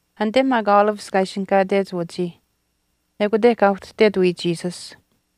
Anite maak Olives kaa ishinihkaatech wachii ekute kaa ituhtet wiya Jesus.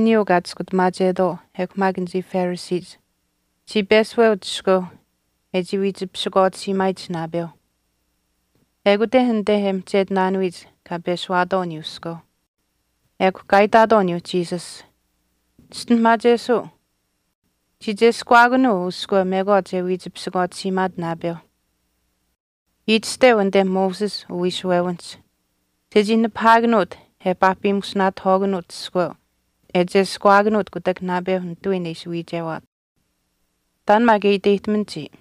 Anichii maak wiishuwewiniyuu kaa chiskutamaachetwaau ekw maak anichii Phariseech chii peshuweuch iskweu e chii wiich pisikwaatisiimaayich naapeuh. Ekut anit e mihchetinaanuyich kaa peshuwaatwaau aniyuu iskweu. Ekw kaa itaatwaau aniyuu Jesus, “Chischinuhamaachesuu, chii cheskuwaakanuu uu iskweu mekwaach e wiich pisikwaatisiimaat naapeu. Itashteu anite Moses uwiishuwewinihch chechii nipahaakanuut e paahpimusinaatihwaakanuut iskweu e cheskuwaakanuut kutak naapeu nitawiin e ishi wiichewaat. Taan maak e iteyihtaman chiya.”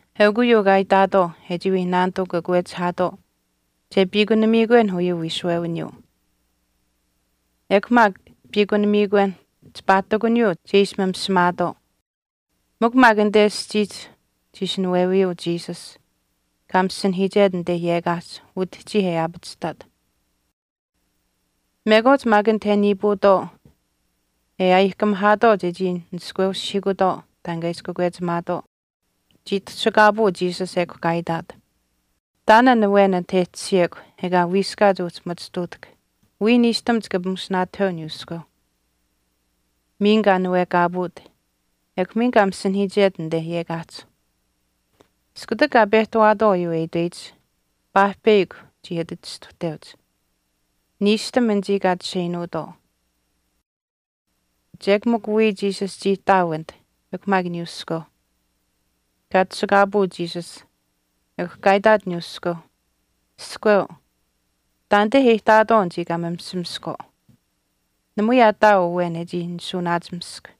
Eukw uyuu kaa itaatwaau e chii wii naanituu kakwechihaatwaau che piikunamiikwen uyuu wiishuwewiniyuu, ekw maak piikunamiikwen chipaa ihtakuniyuu che ishi mimisimaatwaau. Mikw maak anite aschiihch chii ishi nawewiyuu Jesus, kaa masinahiichet anit yekaahch utihchii e aapachihtaat. Mekwaach maak anit e niipuutwaau e aayihkamihaatwaau chechii nishkweushihiikutwaau taan kaa ishi kakwechimaatwaau, chii tashukaapuu Jesus ekw kaa itaat, “Taan an awen anit e tashiyekw ekaa wiiskaat uhchi machituutahk wiya niishtam chika pimushinaatahweu aniyuu iskweu.” Miin kaa nawekaapuut ekw miin kaa masinahiichet anite yekaahch. Iskutak kaa pehtawaatwaau uyuu e itweyich, paahpeyakw chii ati chistuhteuch, niishtam anichii kaa chisheinuutwaau. Chek mikw wiya Jesus chii ihtaau anit ekw maak aniyuuh iskweu. Kaa tashukaapuut Jesus ekw kaa itaat aniyuu iskweu, “Iskweu, taanite e ihtaatwaau anichii kaa mimisimiskwaau. Namui aa ihtaau awen e chii nishuuwanaachimisk.”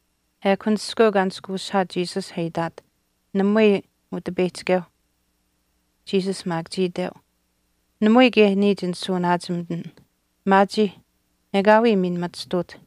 Ekw an iskweu kaa nishkweushihaat Jesus e itaat, “Namui, Utipeyihchikeu.” Jesus maak chii iteu, “Namui kaye niya chinishuuwanaachimitin. Maachiih, ekaawii miin machituut.”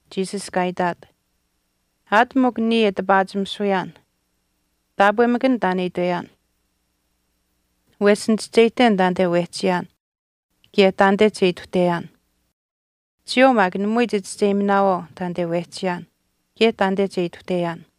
Jesus kaa itaat, “Aat mikw niya e tipaachimisuyaan taapwemakan taan e itweyaan. Wesh nichischeyihten taanite wehchiyaan kaye taanite che ituhteyaan. Chiyawaau maak namui chichischeyiminaawaau taanite wehchiyaan kaye taanite che ituhteyaan.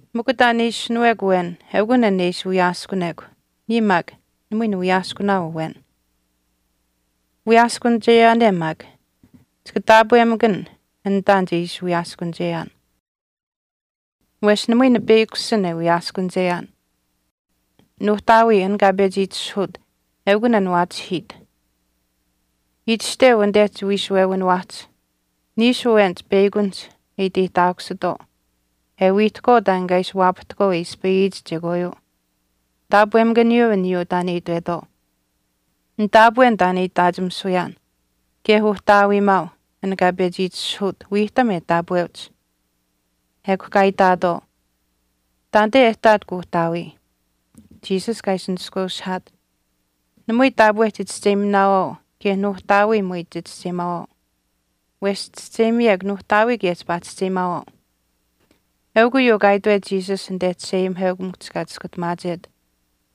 Mikw taan e ishinuwekw awen eukun aniyuu e ishi wiyaaskunekw, niya maak namui niwiyaaskunaau awen. Wiyaaskunicheyaane maak chika taapwemakan an taan che ishi wiyaaskunicheyaan. Wesh namui nipeyakushin e wiyaaskunicheyaan, Nuuhtaawii an kaa pechi itishahuut eukun an waachihiit. Itashteu anite chiwiishuwewiniwaahch niishu awenich peyakunihch e itihtaakusitwaau e wiihtahkwaau taan kaa ishi waapahtahkwaau e ispayiyich chekwaayuu, taapwemakaniyuu aniyuu taan e itwetwaau. Nitaapwen taan e itaachimisuyaan kaye Uhtaawiimaau an kaa pechi itishahuut wiihtam e taapweuch.” Ekw kaa itaatwaau, “Taanite e ihtaat kuuhtaawii.” Jesus kaa ishi nishkweushihaat, “Namui taapwe chichischeyiminaawaau kaye Nuuhtaawii namui chichischeyimaawaau. Wesh chischeyimiyekw Nuuhtaawii kaye chipaa chischeyimaawaau.” Eukw uyuu kaa itwet Jesus anite chisheayimiheukamikuhch kaa chiskutamaachet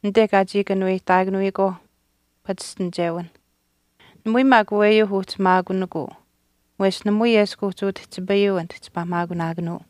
anite kaa chii kanuweyihtaakanuyikwaauh pachishtinichewinh. Namui maak aweyuu uhchi maakunikuu wesh namui eshkw uhchi utihchipayuu anit chipaa maakunaakanuu.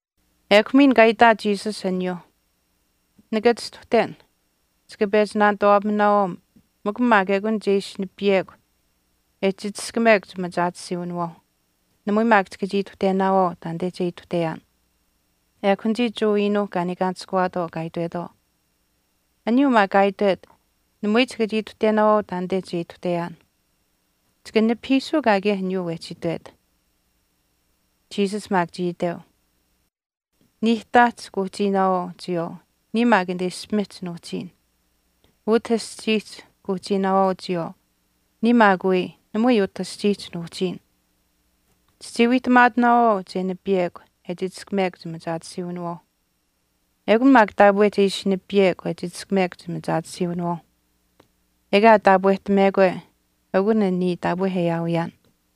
Ekw miin kaa itaat Jesus aniyuuh, “Nika chistuhten, chika pechi naanituwaapaminaawaau mikw maak ekun che ishi nipiyekw e chichishkamekw chimachaatisiiwinawaauh. Namui maak chika chii ituhtenaawaau taanite che ituhteyaan.” Ekw anichii Jewa iinuuh kaa niikaanishkuwaatwaau kaa itwetwaau, “Aniyuu maa kaa itwet, namui chika chii ituhtenaawaau taanite che ituhteyaan. Chika nipahiisuu kaakaye aniyuu wehchi itwet.” Jesus maak chii iteu, “Niihtaahch kuuhchiinaawaau chiyawaau niya maak anite ishpimihch nuuhchiin. Utah aschiihch kuuhchiinaawaau chiyawaau, niya maak wii namui utah aschiihch nuuhchiin. Chichii wiihtamaatinaawaau che nipiyekw e chichishkamekw chimachaatisiiwinawaauh. Ekun maak taapwe che ishi nipiyekw e chichishkamekw chimachaatisiiwinawaauh, ekaa taapwehtamekwe eukun an niya taapwe e aawiyaan.”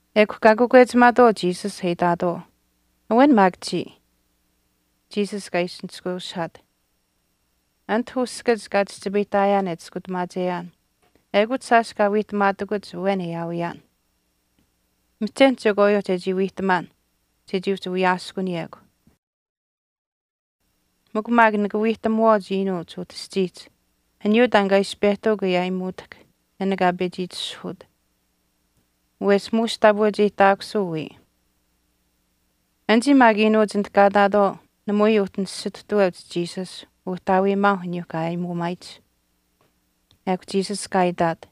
Ekw kaa kakwechimaatwaau Jesus e itaatwaau, “Awen maak chiya.” Jesus kaa ishi nishkweushihaat, “Anit uskach kaa chihchipayihtaayaan e Chiskutamaacheyaan ekut shaash kaa wiihtamaatakuch awen e aawiyaan. Mihchen chekwaayuu chechii wiihtamaan chechii uhchi wiyaaskunikuyekw. Mikw maak nika wiihtamuwaauch iinuuch utah aschiihch aniyuu taan kaa ishi pehtuuk e aayimuutahk an kaa pechi itishahuut, wesh muush taapweucheyihtaakusuu wiya.” Anichii maak iinuuch anit kaa ihtaatwaau namui uhchi nisituhtaweuch Jesus Uhtaawiimaau aniyuuh kaa aayimuumaayich. Ekw Jesus kaa itaat,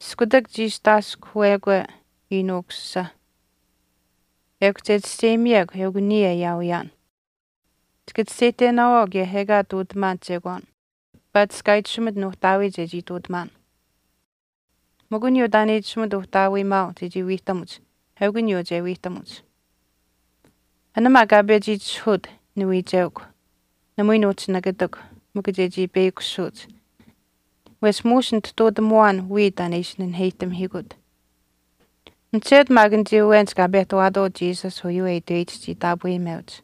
“Iskutak chiistaaskuhwekwe Iinuu Ukusisa ekw che chischeyimiyekw eukw niya e aawiyaan. Chika chischeyihtenaawaau kaye ekaa ihtuutamaan chekwaan paatish kaa itashumit Nuuhtaawii chechii ihtuutamaan. Mikw aniyuu taan e itashumit uhtaawiimaau chechii wiihtamuch eukw aniyuu che wiihtamuch. An maak kaa pechi itishahuut, niwiicheukw, namui nuuhchi nikatikw mikw chechii peyakushuuch wesh muush nitutamuwaan wiya taan e ishi naheyihtamihiikut.” Mihchetu maak anichii awenich kaa pehtawaatwaau Jesus uyuu e itweyich chii taapweyimeuch.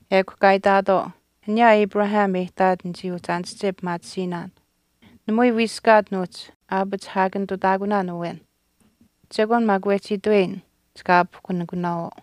Ekw kaa itaatwaau, “Aniyaa Abraham e ihtaat nichii uhchi aanische pimaatisiinaan, namui wiiskaat nuuhchi aapachihaakanitutaakunaan awen. Chekwaan maak wehchi itweyin chika aapihkunikunaawaau.”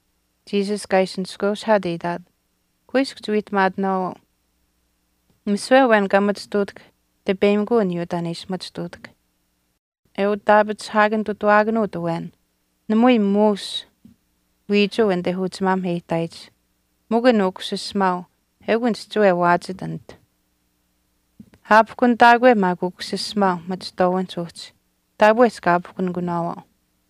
Jesus kaa ishi nishkweushihaat e itaat, “Kuiskw chiwiihtamaatinaawaau, misiwe awen kaa machituutahk tipeyimikuu aniyuu taan e ishi machituutahk. E utaapachihaakanitutaawaakanuut awen namui muush wiichuu anite uchimaam e ihtaayich mikw an ukusisimaau eukw an chihchiwe waachit anit. Aapihkunitaakwe maak Ukusisimaau machihtwaawinihch uhchi taapwe chika aapihkunikunaawaau.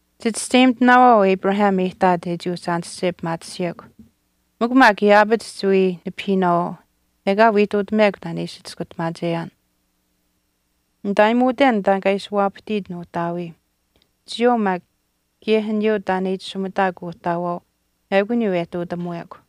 Chichischeyimitinaawaau Abraham e ihtaat e chii uhchi aanische pimaatisiyekw, mikw maak yaapach chiwii nipahiinaawaau ekaa wii nituhtamekw taan e ishi Chiskutamaacheyaan. Nitaayimuuten taan kaa ishi waapahtiit nuuhtaawii. Chiyawaau maak kaye aniyuu taan e itashumitaakw Kuuhtaawaau eukw aniyuu e ihtuutamuwekw.”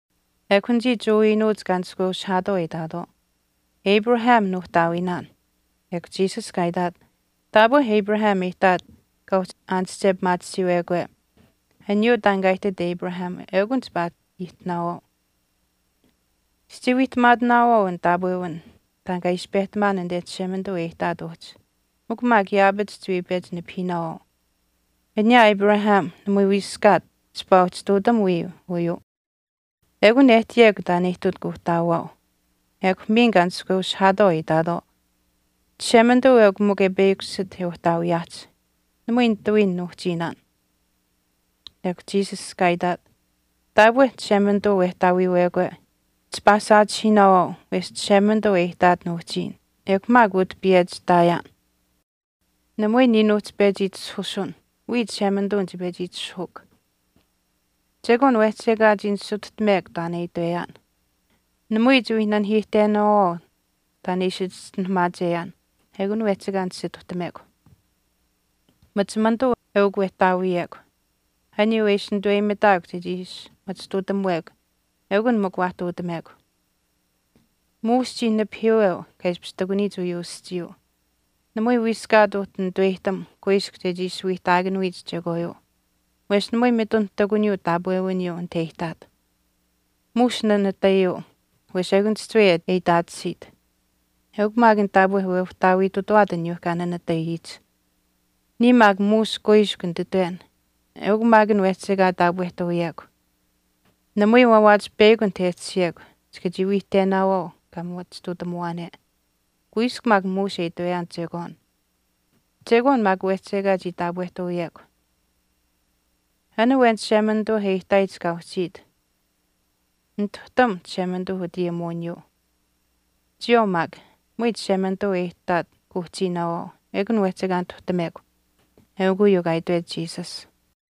Ekw anichii Jewa iinuuch kaa nishkweushihaatwaau e itaatwaau, “Abraham nuuhtaawiinaan.” Ekw Jesus kaa itaat, “Taapwe Abraham e ihtaat kaa uhchi aanische pimaatisiiwekwe aniyuu taan kaa ihtit Abraham ekun chipaa ihtinaawaau. Chichii wiihtamaatinaawaau an taapwewin taan kaa ishi pehtamaan anite Chishemanituu e ihtaat uhchi, mikw maak yaapach chiwii pechi nipahiinaawaau. Aniyaa Abraham namui wiiskaat chipaa uhchi ihtuutam wiya uyuu. Ekun e ihtiyekw taan e ihtit Kuuhtaawaau.” Ekw miin kaa nishkweushihaatwaau e itaatwaau, “Chishemanituu eukw mikw e peyakushit e uhtaawiyaahch. Namui nitawiin nuuhchiinaan.” Ekw Jesus kaa itaat, “Taapwe Chishemanituu wehtaawiiwekwe, chipaa saachihiinaawaau wesh Chishemanituu e ihtaat nuuhchiin ekw maak utah piyechi ihtaayaan. Namui niya nuuhchi pechi itishahusun, wiya Chishemanituu nichii pechi itishahuukw. Chekwaan wehchi ekaa chii nisituhtamekw taan e itweyaan. Namui chiwii nanihiihtenaawaau taan e ishi chischinuhamaacheyaan ekun wehchi ekaa nisituhtamekw. Machimanituu eukw wehtaawiyekw, aniyuu e ishi nituweyimitaakw chechii ishi machituutamuwekw eukun mikw waa ihtuutamekw. Muush chii nipahiiweu kaa ishpish ihtakuniyich uyuu aschiiyuu. Namui wiiskaat uhchi nituweyihtam kuiskw chechii ishi wiihtaakuniyich chekwaayuu wesh namui mitun ihtakuniyuu taapwewiniyuu anit e ihtaat. Muush nanatayuu wesh ekun chihchiwe e itaatisiit, eukw maak an taapwe weuhtaawiitutawaat aniyuuh kaa nanatayich. Niya maak muush kuiskw nititwen eukw maak an wehchi ekaa taapwehtuuyekw. Namui waawaach peyakw anit e tashiyekw chika chii wiihtenaawaau kaa machituutamuwaane. Kuiskw maak muush e itweyaan chekwaan. Chekwaan maak wehchi ekaa chii taapwehtuuyekw. An awen Chishemanituu e ihtaayich kaa uhchiit nituhtam Chishemanituu utayimuwiniyuu. Chiyawaau maak namui Chishemanituu e ihtaat kuuhchiinaawaau ekun wehchi ekaa nituhtamekw.” Eukw uyuu kaa itwet Jesus.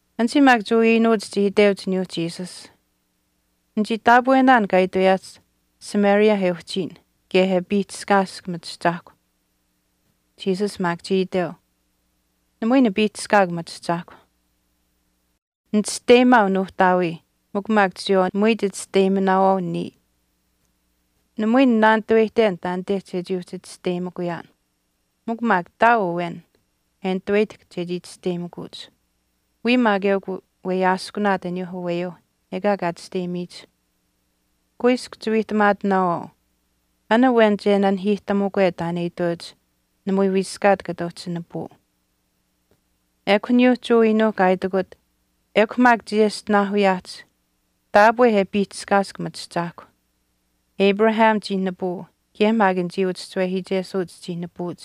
Anichii maak Jewa iinuuch chii iteuch aniyuu Jesus, “Nichii taapwenaan kaa itweyaahch Samaria e uhchiyin kaye e piihchishkaask machiahchaahkw.” Jesus maak chii iteu, “Namui nipiihchishkaakw machiahchaahkw. Nichisteyimaau Nuuhtaawii mikw maak chiyawaau namui chichisteyiminaawaau niya. Namui ninaanitaweyihten taanite chechii uhchi chisteyimikuyaan. Mikw maak ihtaau awen e nituweyihtahk chechii chisteyimikuch, wiya maak eukw weyaaskunaat aniyuu aweyuu ekaa kaa chisteyimiyich. Kuiskw chiwiihtamaatinaawaau, an awen che nanihiihtamukwe taan e iteuch namui wiiskaat kata uhchi nipuu.” Ekw aniyuuh Jewa iinuuh kaa itikut, “Ekw maak chiyeshtinaahuyaahch, taapwe e piihchishkaask machiahchaahkw. Abraham chii nipuu kaye maak anichii uchischiwehiichesuuch chii nipuuch.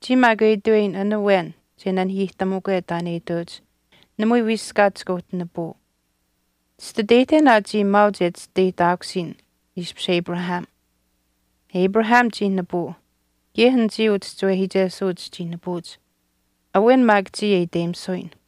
Chiya maak e itweyin an awen che nanihiihtamukwe taan e iteuch namui wiiskaat chika uhchi nipuu. Chititeyihten aa chiya maauch e chisteyihtaakusiyin ishpish Abraham. Abraham chii nipuu kaye anichii uchischiwehiichesuuch chii nipuuch, awen maak chiya e iteyimisuyin.”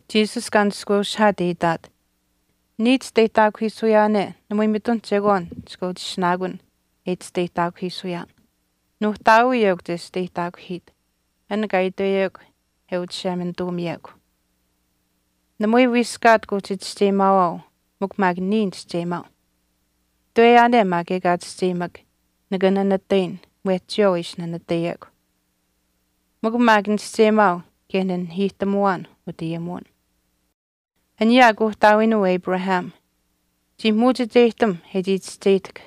Jesus kaa nishkweushihaat e itaat, “Niya chisteyihtaakuhiisuyaane namui mitun chekwaan chika uhchi ishinaakun an e chisteyihtaakuhiisuyaan. Nuuhtaawii eukw chesteyihtaakuhiit, an kaa itweyekw e Uchishemanituumiyekw. Namui wiiskaat kuuhchi chischeyimaawaau mikw maak niya nichischeyimaau. Itweyaane maak ekaa chischeyimak, nika nanatayin mwehch chiyawaau e ishi nanatayiyekw. Mikw maak nichischeyimaau kaye nanihiihtamuwaan utayimuwin. Aniyaa kuuhtaawiinuu Abraham chii muuchicheyihtam e chii chischeyihtahk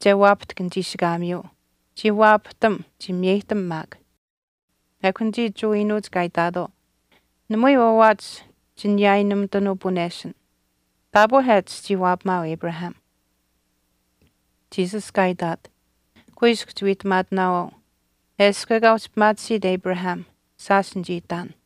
che waapahtahk nichiishikaamiyuu. Chii waapahtam, chii miyeyihtam maak.” Ekw anichii Jewa iinuuch kaa itaatwaau, “Namui waawaach chiniyaayinumitanuu puneshin, taapwe aa chichii waapamaau Abraham.” Jesus kaa itaat, “Kuiskw chiwiihtamaatinaawaau, eshkw ekaa uhchi pimaatisiit Abraham, shaash nichii ihtaan.”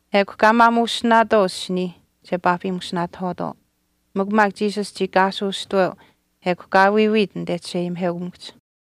Ekw kaa maamuushtinaatwaau asiniih che paahpimusinaatahwaatwaau. Mikw maak Jesus chii kaasuustuweu ekw kaa wiiwiit anite chisheayimiheukamikuhch.